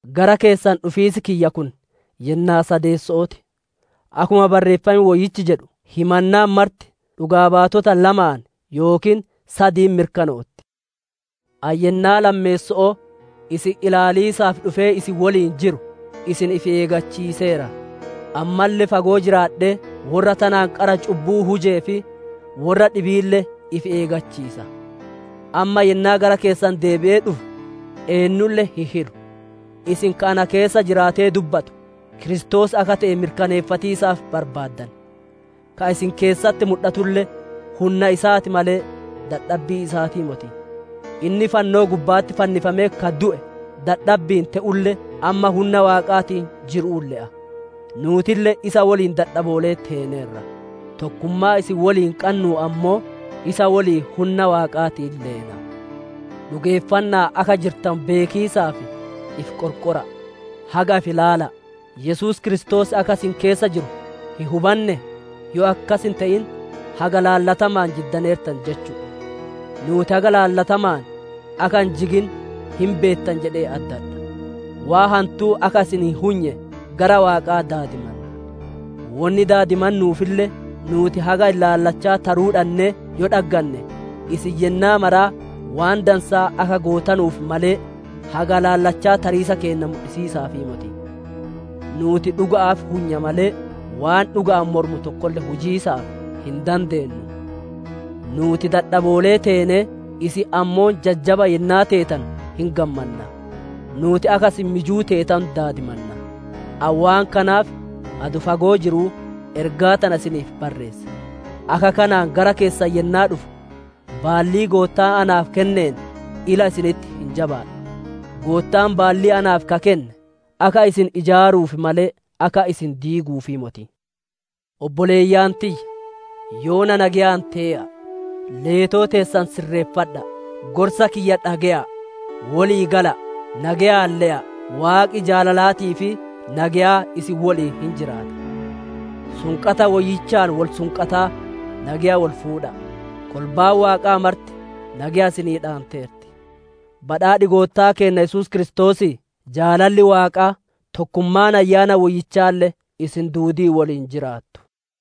Gara keessan dhufiis kiyya kun yennaa sadeesso'oo ti; akkuma Barreeffam Woyyichi jedhu, «Himannaan marti dhugaa baatota lamaan yookiin sadiin mirkanootti». Ani yennaa lammeesso'oo isin ilaaliisaaf dhufee isin woliin jiru, isin ifi eeggachiiseera. Ammalle fagoo jiraadhee, worra tanaan qara cubbuu hujee fi worra dhibiille ifi eeggachiisa; amma yennaa gara keessan deebi'ee dhufu eennulle hin hilu. Isin ka ana keessa jiraatee dubbatu Kiristoos akka te'e mirkaneeffatiisaaf barbaaddan; ka isin keessatti mudhatulle hunna isaa ti malee, dadhabbii isaatii moti. Inni fannoo gubba'atti fannifamee ka du'e dadhabbi'iin te'ulle, amma hunna Waaqaatiin jiru'uun le'a; nuutille isa woliin dadhaboolee teeneerra; tokkummaa isin woliin qannuun ammoo, isa woliin hunna Waaqaatiin leena. Dhugeeffanna'aan akka jirtanu beekiisaaf ifi qorqora'a; haga ifi ilaala'a; Yesuus Kiristoos akka isin keessa jiru hin hubannee? Yoo akkas hin te'in haga ilaallatamaan jiddaneertan jechu'u. Nuuti haga ilaallatamaan akka hin jigin hin beettan jedhee addadha. Waan hantuu akka isin hin hunye, gara Waaqa daadimanna; wonni daadimannuufille nuuti haga ilaalcha taruu dhannee yoo dhagganne, isin yennaa maraa waan dansaa akka gootanuuf malee, haga ilaalcha tariisa keenna mudhisiisaafii moti. Nuuti dhuga'aaf hunya malee, waan dhuga'aan mormu tokkolle hujiisaaf hin dandeennu. Nuuti dadhaboolee teenee, isin ammoo jajjaba yennaa teetanu hin gammanna; nuuti akka isin mijuu teetanu daadimanna. Ani waan kanaaf, adoo fagoo jiruu ergaa tana isiniif barreesse; akka kanaan gara keessan yennaa dhufu, baallii Goottaan naaf kenneen ila isinitti hin jabaadhu; Goottaan baallii naaf ka kenne akka isin ijaaruuf malee, akka isin diiguufii moti. Obboleeyyan tiyya! Yoona nageyaan tee'a'a; leetoo teessan sirreeffadha'a; gorsa kiyya dhage'a'a; wolii gala'a; nageyaan le'a'a; Waaqi jaalalaatii fi nageyaa isin woliin hin jiraata. Sunqata woyyichaan wol sunqataa nageya wol fuudha'a. Kolbaan Waaqaa marti nageya isinii dhaanteerti. Badhaadhi Goottaa Yesuus Kiristoosii, jaalalli Waaqaa, tokkummaan Ayyaana Woyyichaalle isin duudii woliin jiraattu.